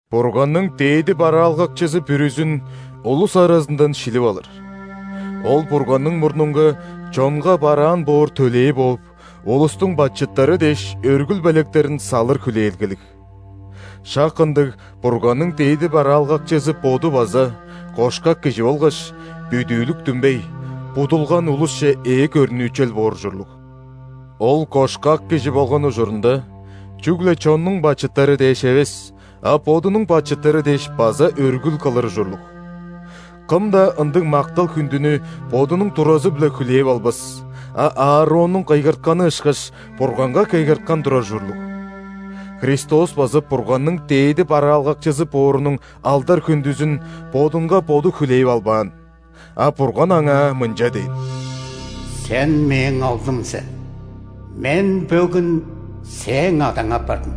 Бурганның дээди бараалгакчызы бүрүзүн улус аразындан шилип алыр. Ол Бурганның мурнунга чонга бараан боор төлээ бооп, улустуң бачыттары дээш өргүл белектерин салыр хүлээлгелиг. Шак ындыг Бурганның дээди бараалгакчызы боду база кошкак кижи болгаш, бүдүүлүк-дүмбей, будулган улусче ээ көрнүүчел боор ужурлуг. Ол кошкак кижи болган ужурунда, чүгле чоннуң бачыттары дээш эвес, а бодунуң бачыттары дээш база өргүл кылыр ужурлуг. Кым-даа ындыг мактал-хүндүнү бодунуң туразы-биле хүлээп албас, а Аароннуң кыйгыртканы ышкаш, Бурганга кыйгырткан турар ужурлуг. Христос база Бурганның дээди бараалгакчызы боорунуң алдар-хүндүзүн Бодунга Боду хүлээп албаан. А Бурган Аңаа мынча дээн:«Сен – Мээң Оглум сен,Мен бөгүн Сээң Адаң апардым».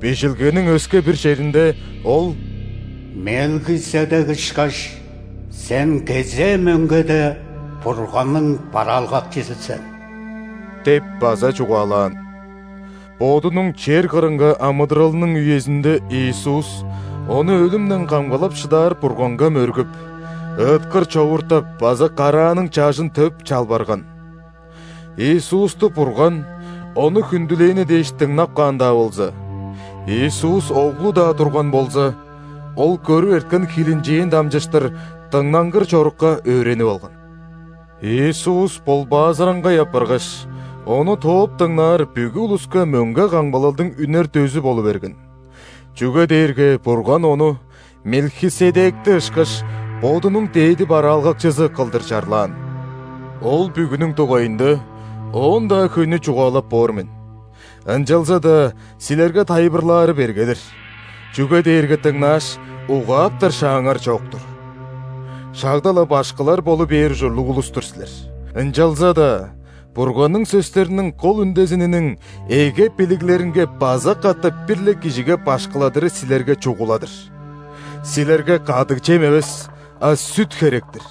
Бижилгениң өске-бир черинде Ол:«Мелхиседек ышкаш, Сен кезээ мөңгеде Бурганның бараалгакчызы сен» – деп база чугаалаан. Бодунуң чер кырынга амыдыралының үезинде Иисус Ону өлүмден камгалап шыдаар Бурганга мөргүп, ыыткыр човууртап база карааның чажын төп, чалбарган. Иисусту Бурган Ону хүндүлээни дээш дыңнап каан-даа болза, Иисус Оглу-даа турган болза, Ол көрүп эрткен хилинчээн дамчыштыр дыңнангыр чорукка өөренип алган. Иисус ·болбаазыраңгай апаргаш, Ону тооп дыңнаар бүгү улуска мөңге камгалалдың үнер дөзү болу берген, чүге дээрге Бурган Ону, Мелхиседекти ышкаш, Бодунуң дээди бараалгакчызы кылдыр чарлаан. Ол бүгүнүң дугайында оон-даа хөйнү чугаалап боор мен, ынчалза-даа силерге тайылбырлаары берге-дир, чүге дээрге дыңнааш, угааптар шааңар чок-тур. Шагда-ла башкылар болу бээр ужурлуг улус-тур силер, ынчалза-даа Бурганның сөстериниң кол үндезининиң эге билиглеринге база катап бир-ле кижиге башкыладыры силерге чугула-дыр. Силерге кадыг чем эвес, а сүт херек-тир!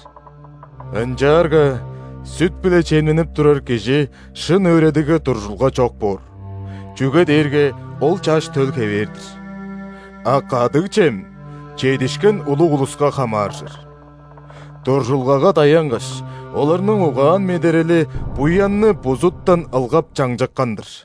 Ынчаарга сүт-биле чемненип турар кижи шын өөредигге дуржулга чок боор, чүге дээрге ол чаш төл хевээр-дир. А кадыг чем чедишкен улуг улуска хамааржыр. Дуржулгага даянгаш, оларның угаан-медерели буянны бузуттан ылгап чаңчыккан-дыр.